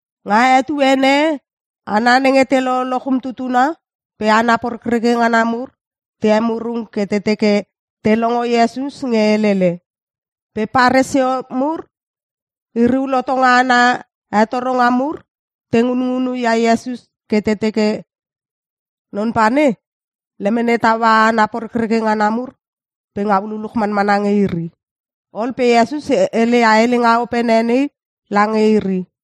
Nga etuene e hana nenge te loloch umtutuna pe hana porekreke ngana mur te emurung ke te teke te longo Iesus nge helele. Pe Paresio mur iri ul hotonga ana hetoronga mur te ngunngunu ia Iesus ke te teke, “Non pane lemene taua hana porekreke ngana mur pe ngau luluch manmana nge iri.” Ol pe Iesus hele ia helenga opene nei lange iri.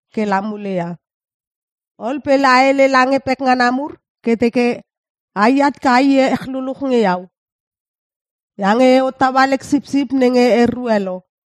ke la mule ia. Ol pe la hele lange pekngana mur ke teke aiat ke a iech luluch nge iau. Iange e hottaua lek sipsip nenge erue lo.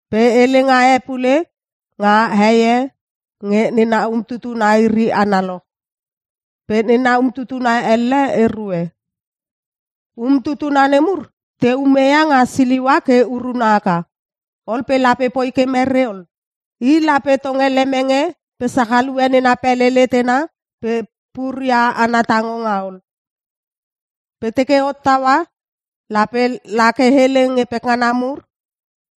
“Pe helenga e pule nga hei e nge nena umtutuna iri analoch. Pe nena umtutuna elle erue. (umtutuna nemur te ume nga siliua ke uruna aka) Ol pe lape poi ke mere ol? I lape tonge lemenge pe sachalue nena pele letena pe puria ana tangonga ol. Pe teke hottaua lape lake hele nge pekngana mur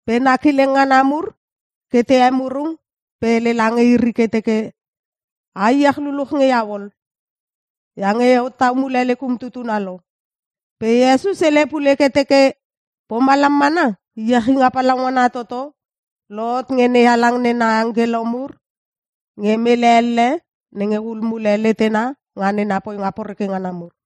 pe na kileng ngana mur ke te emurung pe hele lange iri ke teke, ‘A iech luluch nge iau ol. Iange e hottau mule lek umtutuna lo.’” Pe Iesus hele pule ke teke, “Pomalam mana iechinga palaungana toto lohot nge NeHalang nena angkelo mur nge mele elle nenge hul mule letena nga nena poinga poreke ngana mur.”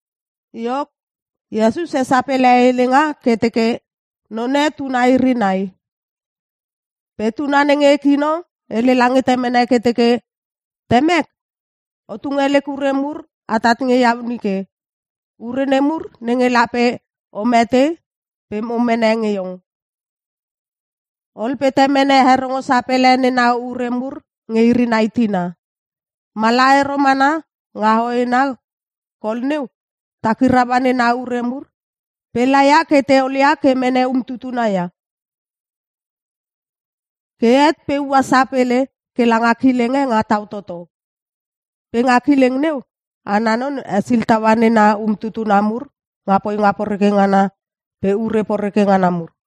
Iok, Iesus hesapele helenga ke teke, “None tuna iri nai. Pe tuna nenge kino hele lange temene ke teke, ‘Temek, o tunge lek ure mur atat nge iau nike. Ure nemur nenge lape o mete pe mo mene nge iong.’ Ol pe temene herongo sapele nena ure mur nge iri nai tina. “Mala ero mana nga hoena kol neu takiraua nena ure mur pe laia ke te olia ke mene umtutuna ia. Ke het pe ua sapele ke langa kileng e nga tau toto. Pe nga kileng neu ana non hesil taua nena umtutuna mur nga poinga poreke ngana pe ure poreke ngana mur.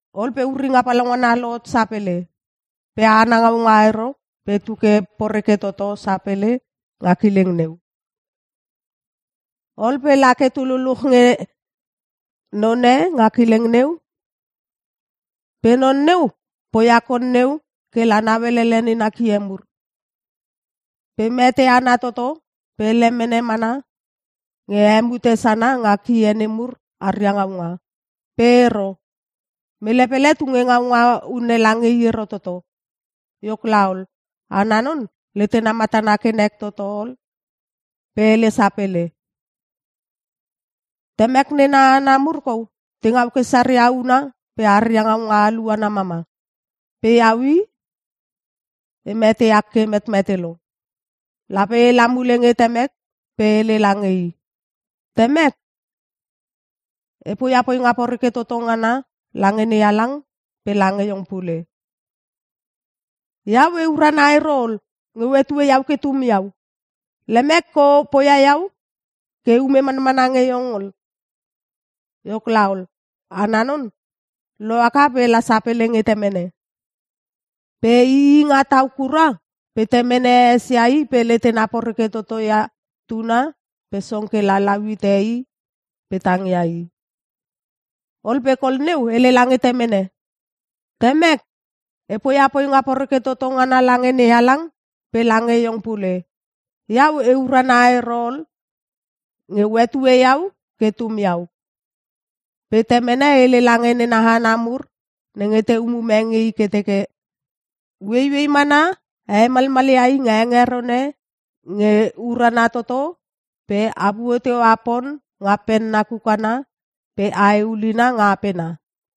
Ol pe uringa palaungana lohot sapele. Pe ana ngaunga ero pe tu ke poreke toto sapele nga kileng neu. Ol pe lake tu luluch nge none nga kileng neu pe non neu poia kol neu ke la nauelele nena kie mur. Pe mete ana toto pe lemene mana nge hemute sana nga kie nemur aria ngaunga. Pe ero. Mele pele tunge ngaunga unne lange i ero toto. “Iok laol, ana non letena matana ke nek toto ol pe hele sapele, ‘Temek nena hana mur kou te ngau ke saria unna pe aria ngaunga aluana mama. Pe iau i! E meteak ke e metmete lo! Lape ela mule nge temek pe e hele lange i, “Temek, e poia poinga poreke toto ngana lange NeHalang pe lange iong pule. Iau e urana ero ol nge o hetue iau ke tum iau. Lemek ke o poia iau ke eume manmana nge iong ol.” ’ Iok laol, ana non lohaka pe la sapele nge temene. “Pe ii nga tau kura pe temene esia i pe letena poreke toto ia tuna pe song ke la lau hite i pe tangia i. Ol pe kol neu hele lange temene, ‘Temek, e poia poinga poreke toto ngana lange NeHalang pe lange iong pule. Iau e urana ero ol nge o hetue iau ke tum iau.’ “Pe temene hele lange nena hana mur nenge te umume nge i ke teke, ‘Ueiuei mana a hemalmalia i nga hengeron e nge urana toto pe apuo teua pon nga penna kukana pe ae ulina nga apena.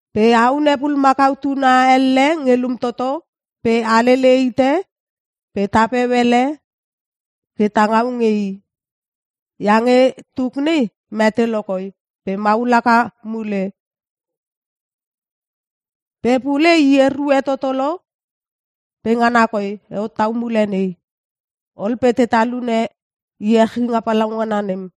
Pe a hune pulumakau tuna elle nge lum toto pe a lele hite pe tapeu ele ke ta ngau nge i. Iange tuk nei mete lokoi pe mahul haka mule! Pe pule i erue toto lo pe ngana koi e hottau mule nei!’ Ol pe te talune iechinga palaungana nem.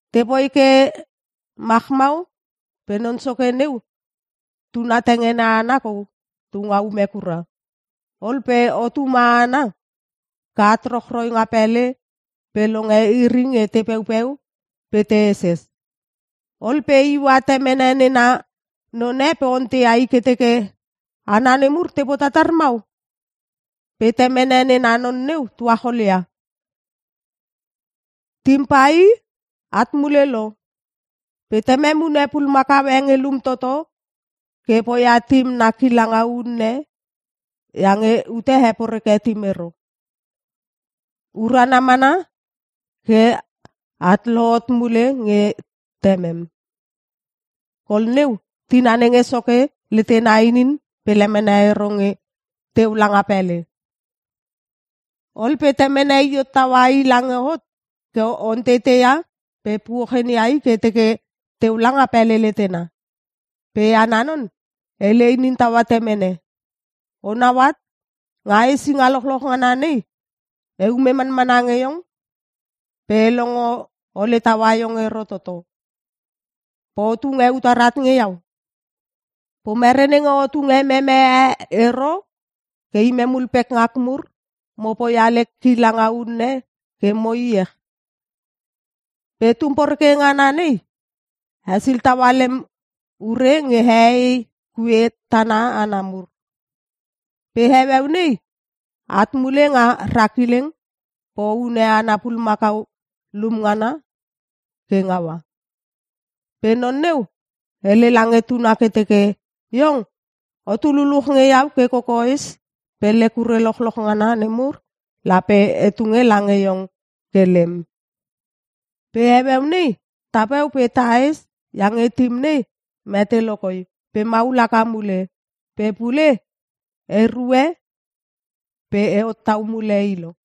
“Tepoi ke machmau pe non soke neu tuna tengene ana kou tu nga ume kura. Ol pe hot ume ana ke at rochroi nga pele pe longe iri nge te peupeu pe te heses. Ol pe iua temene nena none pe onteia i ke teke, ‘Hana nemur te potatar mau?’ Pe temene nena non neu tuacholia, ‘Tim pai at mule lo. Pe temem hune pulumakau e nge lum toto ke poia tim na kilanga unne iange ute heporeke tim ero. Urana mana ke at lohot mule nge temem.’ “Kol neu tina nenge soke letena inin pe lemene ero nge teu langa pele. Ol pe temene i hot taua i lange hot ke onteiteia pe puochenia i ke teke teu langa pele letena. Pe ana non hele inin taua temene, ‘Onau at, nga hesinga lochoch ngana nei eume manmana nge iong pe e longo ole taua iong ero toto. Pe o tunge utar at nge iau? Pomere nenge o tunge meme e ero ke imem ul pekngak mur mo poia lek kilanga unne ke mo iech? Pe tum poreke ngana nei hesil taua lem ure nge hehei kue tana ana mur. Pe heueu nei at mule nga ra kileng pe o hune ana pulumakau lum ngana ke ngaua.’ “Pe non neu hele lange tuna ke teke, ‘Iong, otu luluch nge iau ke kokoes pe lek ure lochloch ngana nemur lape e tunge lange iong ke lem. Pe heueu nei tapeu pe tahes iange tim nei mete lokoi pe maul haka mule. Pe pule erue pe e hottau mule i lo.’”